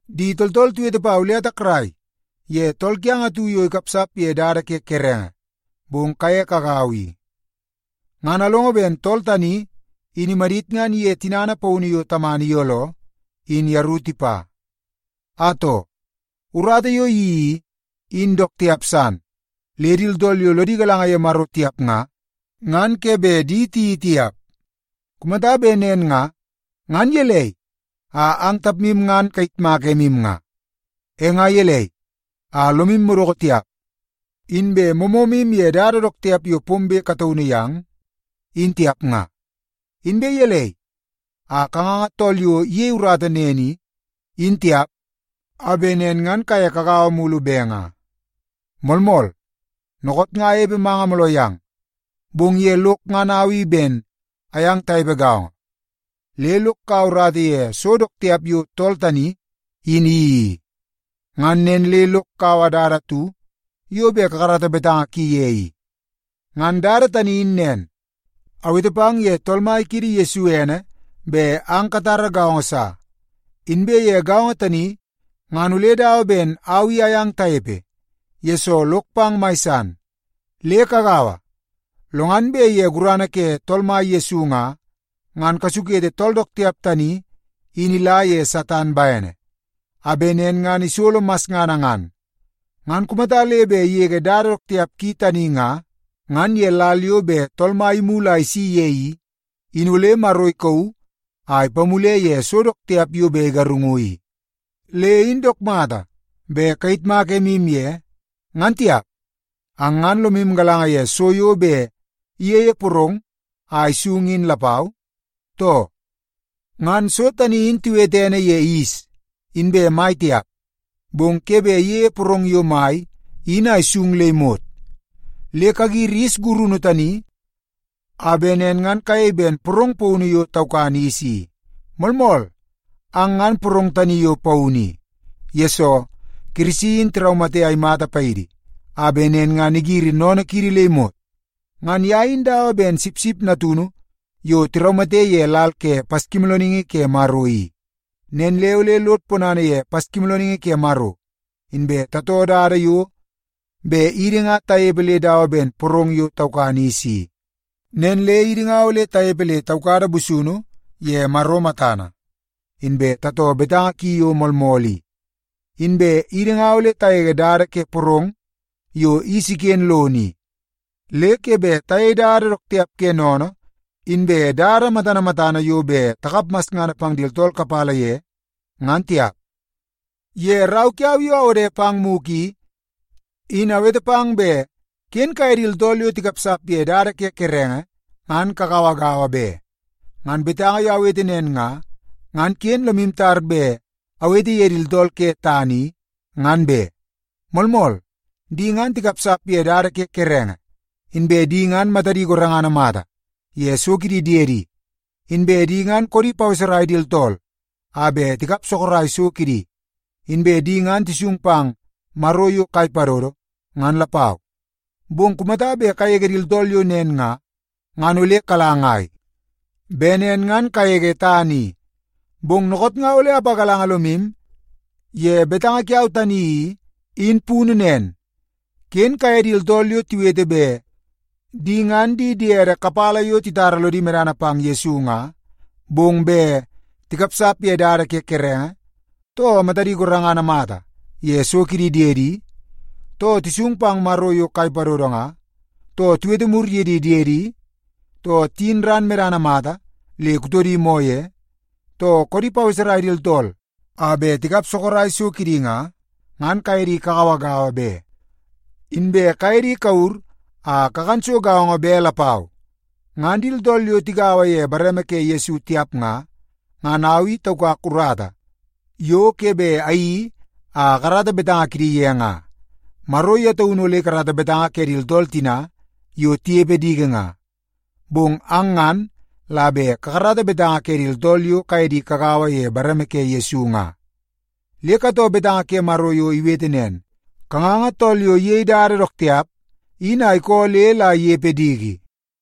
Di tooltool tiwete pau le atakrai ye tool kiang atu yo ikapsap ye dada ke kerenge, bong kaye kagaua i. Ngan alongo ben tool tani in imadit ngan iye tinana paunu yo tamana iyooloo in yeru tipa. Atoo, urata yo iyeii i, in dook tiap san le di tooltool yo lodi galanga ye Maro tiap nga, ngan ke bet di tiyeii tiap. Kumata bet nen nga, ngan gelei a ang tapmu ngan kayitmak emu nga? E nga gelei a lomu madoko tiap, inbe moomoomu ye dada dook tiap yo pombe kataunu yang in tiap nga? Inbe gelei a kanganga tool yo iyei urata nen i, in tiap, a bet nen ngan kaye kagaua mulu be nga? Moolmool, dookoot nga anepe manga mooloo yang, bong ye lok ngan au i ben ayang tanepe gaongo. Le lok kaua urata ye so dook tiap yo tool tani in iyeii i. Ngan nen le lok kaua dada atu yo bet kakarata betanga ki ye i. Ngan dada tani in nen, awete pang ye Tool Mai kiidi Yesu ene bet ang katara gaongo sa. Inbe ye gaongo tani ngan ole dawa ben au i ayang tanepe, yesoo lok pang mai san. Le kagaua, lo ngan bet ye gurana ke Tool Mai Yesu nga, ngan kasukete tool dook tiap tani in ila ye Satan bene, a bet nen ngan isolo masngana ngan. Ngan kumata le bet igege dada dook tiap ki tani nga, ngan ye lal yo bet Tool Mai imulu a isi ye in nga, ngan ole Maro ikauu a ipamule ye so dook tiap yo bet igarungu i. Le in dook mata bet kayitmak emu ye, ngan tiap. Ang ngan lomu galanga ye so yo bet iyeie porong a isung in lapau, too? Ngan so tani in tiwete ene ye yis inbe mai tiap, bong ke bet iyeie porong yo mai in a isung le imot. Le kagiri yis gurunu tani a bet nen ngan kayei ben porong paunu yo taukan yis i. Moolmool, ang ngan porong tani yo paunu i, yesoo Kirisi in tiraumate a imata paidi a bet nen ngan igiri sennene kiidi le imot. Ngan ye in dawa ben sipsip natunu yo tiraumate ye lal ke Paskimoolooningi ke Maro i. Nen le ole lod ponana ye Paskimoolooningi ke Maro, inbe tatoo dada yo bet idi nga tanepe le dawa ben porong yo taukan yis i. Nen le idi nga ole tanepe le taukada busunu ye Maro matana, inbe tatoo betanga ki yo moolmool i. Inbe idi nga ole tagege dada ke porong yo yis iken lono i. Le ke bet tayei dada dook tiap ke sennene, inbe dada matana matana yo bet takap masngana pang di tooltool kapala ye nga, ngan tiap. Ye rau kiau yo awode pang mugu i, in awete pang bet ken kaye di tooltool yo tikapsap ye dada ke kerenge ngan kagauagaua be. Ngan betanga yo awete nen nga, ngan ken lomu tar bet awete ye di tooltool ke tana i, ngan be. Moolmool, di ngan tikapsap ye dada ke kerenge, inbe di ngan matadi gorengana mata ye so kidi diedi, inbe di ngan koodi paweserai di tooltool a bet tikap sorok so kidi, inbe di ngan tisung pang maro yo kai padodo ngan lapau. Bong kumata bet kagege di tooltool yo nen nga, ngan ole kala ngai? Bet nen ngan kagege tana i. Bong dookoot nga ole apagalanga lomu ye betanga kiau tani i, in punu nen. Ken kaye di tooltool yo tiwete bet di ngan di diede kapala yo titara lodi medana pang Yesu nga, bong bet tikapsap ye dada ke kerenge, too matadi gorengana mata ye so kidi diedi, too tisung pang maro yo kai padodo nga, too tiwete mur ye di diedi, too tiyin ran medana mata le kutodi moo ye, too koodi paweserai di tooltool a bet tikap sorok so kidi nga, ngan kaye di kagauagaua be. Inbe kaye di kawur a kakan so gaongo be lapau. Ngan di tooltool yo tigaua ye bareme ke Yesu tiap nga, ngan au i taukak urata yo ke bet ayeii a akarata betanga kidi ye nga. Maro ye taunu ole ikarata betanga ke di tooltool tina yo tinepe diki nga. Bong ang ngan la bet kakarata betanga ke di tooltool yo kaye di kagaua ye bareme ke Yesu nga. Le katoo betanga ke Maro yo iwete nen, “Kanganga tool yo iyei dada dook tiap in a ikoo le la inepe diki.”